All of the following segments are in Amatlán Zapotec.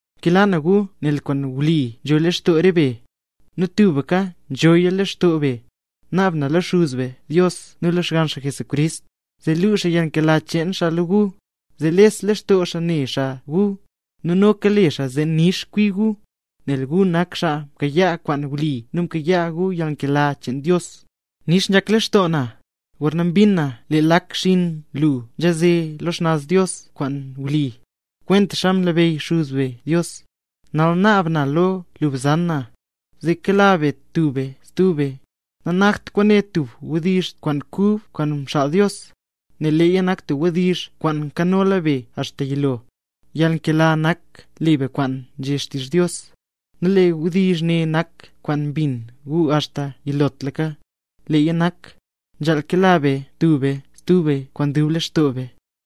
Nkela na gu nel kwaan wli nzho lextoo re be, nu tubka nzhoya lextoo be. Naab na lo Xuz be Dios nu lo Xgann xaa Jesucrist, zee luu xaa yalnkela cheen xaa lo gu, zee les lextoo xaa ne xaa gu, nu noka le xaa zee nix kwi gu, nel gu nak xaa mkayaa kwaan wli nu mkayaa gu yalnkela cheen Dios. Nix nzhak lextoo na, gorna mbin na lee lak xinn lu nzhaze lo xnaz Dios kwaan wli, kwentaxa mnabeyy Xuz be Dios. Nal naab na lo lu bzan na, zee kela be tub be stub be. Nanakt kwaane tub wdizh kub kwaan mxaal Dios, nel leeya nak tub wdizh kwaana mkanola be axta yilo. Yalnkela nak le be kwentaxa nzhé xtizh Dios; nu lee wdizh ne nak kwaan mbin gu axta yilotlaka; leeya nak: “Nzhaal kela be tub be stub be kwaan dub lextoo be”.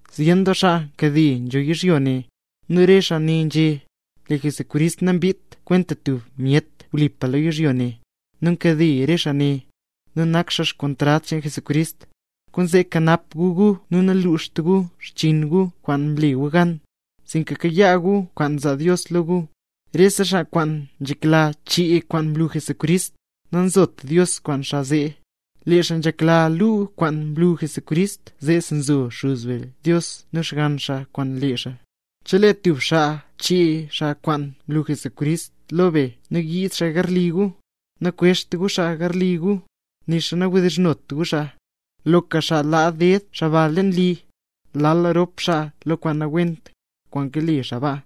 Zyen doo xaa nkade nzho yizhyo ne, nu re xaa ne nzhé: “Lee Jesucrist nambiidt kwenta tub myet wlipa lo yizhyo ne”. Nu nkade re xaa ne, nu nak xaa kontrad cheen Jesucrist. Kwaanzee kanap gu gu zee naluxt gu xchiin gu kwaan mle gu gan, sinka kayaa gu kwaan zaa Dios lo gu. Rese xaa kwaan nzhekla chee kwaan mlu Jesucrist, nanzot Dios kwaan xaa zee. Lee xaa nzhekla luu kwaan mlu Jesucrist, zeesi zo Xuz be Dios nu Xgann xaa kwaan lee xaa. Chelee tub xaa nchee xaa kwaan mlu Jesucrist lo be nu yiid xaa garli gu, nakwezht gu xaa garli gu, nixa nawdizhnot gu xaa. Loka xaa laa ded xaa ba leen li, lal rop xaa lo kwaan nawent, kwaan kale xaa ba.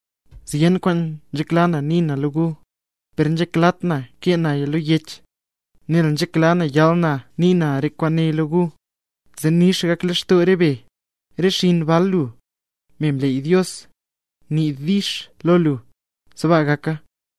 Zyen kwaan nzhekla na nii na lo gu, per nanzheklat na kee naya lo yech, nel nzhekla na yal na nii na re kwaane lo gu, zee nix gak lextoo re be. Re xinn bal lu, me mleey Dios, nii “dix” lo lu. Sbaa gaka.